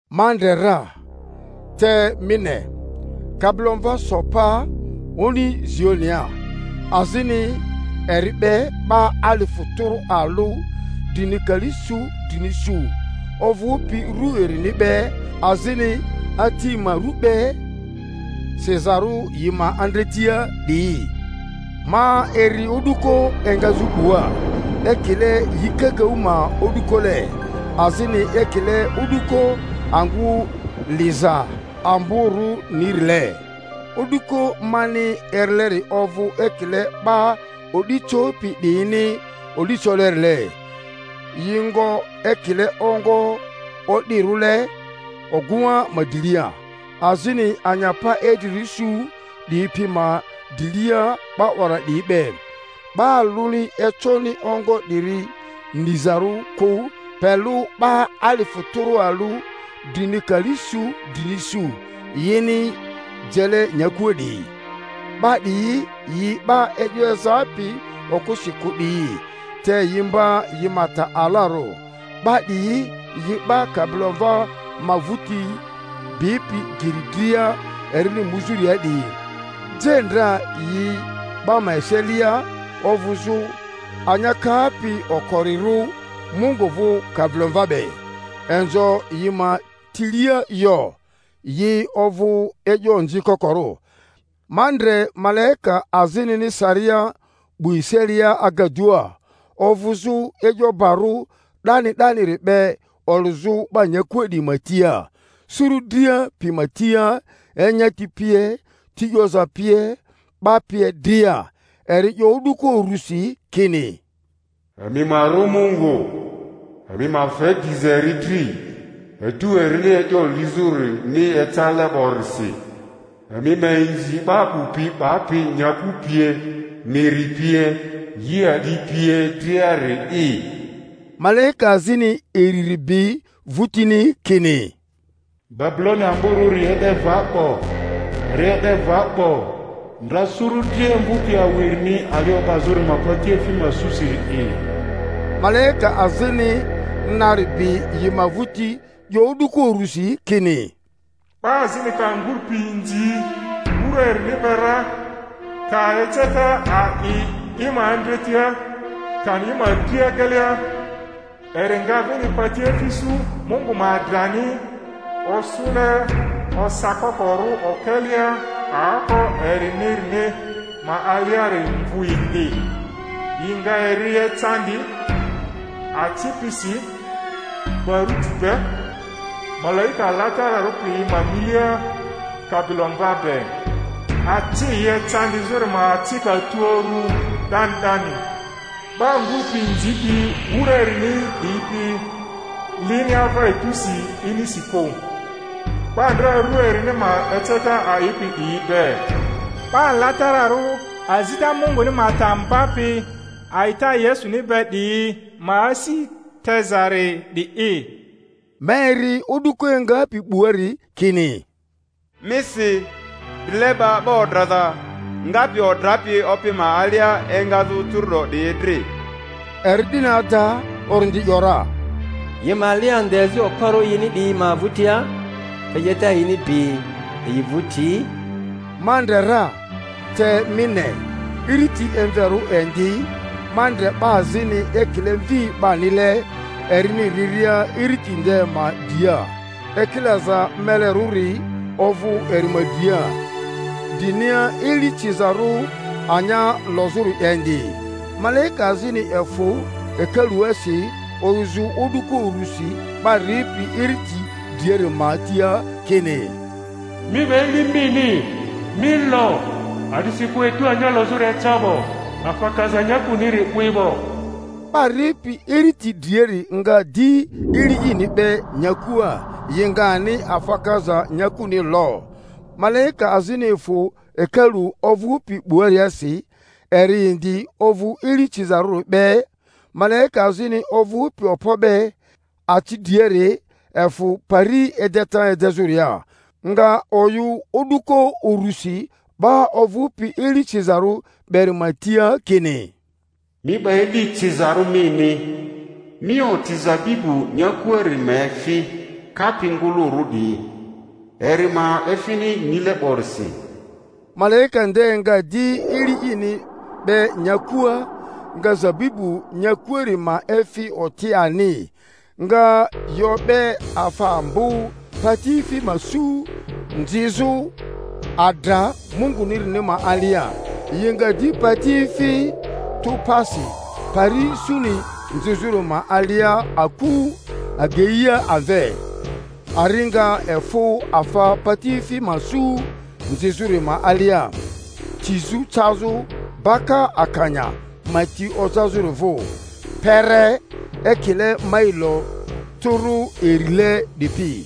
Ma ndre ra, te mi ne, Kabilomva so pa oni Zionia, azini eri be 'ba alifu tᴜrᴜ alᴜ drini kali su drini su, ovᴜpi ru erini be azini Ati ma rᴜ be sizarᴜ yi ma andretia 'diyi. Ma eri o'duko engazᴜ 'bua, ekile yi kakaᴜ ma o'dukole, azini ekile o'duko angᴜ liza amborᴜnirile; o'duko mani erileri ovᴜ ekile 'ba o'di copi 'diyini o'di colerile, yi.ngo ekile ongo o'dirᴜle oguŋa ma drilia, azini anyapa idrirᴜ su 'diyi pi ma drilia 'ba 'wara 'diyi be. 'Ba alᴜni econi ongo 'diri nizarᴜ kᴜ pe lᴜ 'ba alifᴜ tᴜrᴜ alᴜ drini kali su drini su, yini jele nyakua 'diyi. 'Ba 'diyi yi 'ba e'yo ezapi okᴜsi kᴜ 'diyi, te yi mba yi ma ta alarᴜ; 'ba 'diyi yi 'ba Kabilomva ma vᴜti bipi geri dria erini muzᴜria 'diyi; je ndra yi 'ba ma eselia ovᴜzᴜ anya kapi okorirᴜ Mungu vᴜ Kabilomva be; inzo yi ma tilia yo, yi ovᴜ e'yo onzi kokorᴜ. Ma ndre malaika azinini.saria 'bu eselia agadua, ovᴜzᴜ e'yo barᴜ 'dani 'daniri be olᴜzᴜ 'ba nyakua 'diyi ma tia, suru dria pi ma tia, enyati pie, ti 'yoza pie, 'ba pie dria; eri 'yo o'duko urusi kini, Emi ma rᴜ Mungu, emi ma fe diza eri dri, etu erini e'yo lizᴜrini ecale 'borisi; emi ma inzi 'ba 'bu pi 'bapi nyaku pie, miri pie, yi a'di pie driari'i. Malaika azini iriri bi vᴜtini, kini, Babuloni amborᴜri e'de va 'bo, eri e'de va 'bo, ndra suru dria emvᴜpi awu erini ali o'bazᴜri ma patiefi ma susiri'i. Malaika azini nari bi yi ma vᴜti 'yo o'duko urusi kini, 'Ba azini ka nguru pi inzi wura erini be ra, ka eceta a'i i ma andretia kani i ma dri agelia, eri nga vini patiefi su Mungu ma adrani, osᴜle osakokorᴜ okelea aoko erinirini ma aliari mvᴜ indi; yi nga eri.ecandi aci pisi baruti be, malaika alatararᴜ piyi ma milia Kabilomva be. Aci yi ecandi-zᴜri ma acika tu uru 'dani 'dani; 'ba nguru pi inzipi wura erini 'diyi pi lini ava etusi inisi kᴜ, 'ba ndra ru erini ma eceta a'ipi 'diyi be. 'Ba alatararᴜ azita Munguni ma ta mbapi a'ita Yesuni be 'diyi ma asi tezari 'di'i. Ma eri o'duko engapi 'buari kini, Mi si: Drileba 'ba odraza ngapi odrapi Opi ma alia engazᴜ curu'do 'diyi dri. Eri 'dini ada, Orindi ‘yora, yi ma li ande azi okporᴜ yini 'diyi ma vᴜtia, te 'yeta yini bi yi vᴜti! Ma ndre ra, te mi ne, iriti emverᴜ indi; ma ndre 'ba azini ekile mvi 'banile erini riria iriti nde ma dria, ekilaza melerᴜri ovᴜ eri ma dria, drinia eli cizarᴜ anya lozᴜri indi. Malaika azini efᴜ hekaluasi oyᴜzᴜ o'duko urusi 'ba ripi iriti driari ma tia kini, Mi 'ba eli mini, mi lo, a'disikᴜ etu anya lozᴜri eca 'bo, afa kaza nyakuniri 'wi 'bo. 'Ba ripi iriti driari nga di eli ini 'be nyakua, yi nga ani afa kaza nyakuni lo. Malaika azini efᴜ hekalu ovᴜpi 'buariasi, eri indi ovᴜ eli cizarᴜri be. Malaika azini ovᴜpi okpo be aci driari efᴜ pari edeta edezᴜria, nga oyᴜ o'duko urusi 'ba ovᴜpi eli cizarᴜ beri ma tia kini, Mi 'ba eli cizarᴜ mini, mi oti zabibu nyakuari ma efi kapi ngᴜlᴜrᴜ 'diyi, eri ma efini nile 'borisi. Malaika nde nga di eli ini 'be nyakua, nga zabibu nyakuari ma efi oti ani, nga yi o'be afa ambo patiefi ma su nzizᴜ adra Mungunirini ma alia; yi nga di patiefi tᴜ pasi pari suni nzizᴜri ma alia aku ageia amve, ari nga efᴜ afa patiefi ma su nzizᴜri ma alia, tizᴜ cazᴜ baka akanya ma ti ojazᴜri vᴜ, kpere ekile mailo tᴜrᴜ irile 'dipi.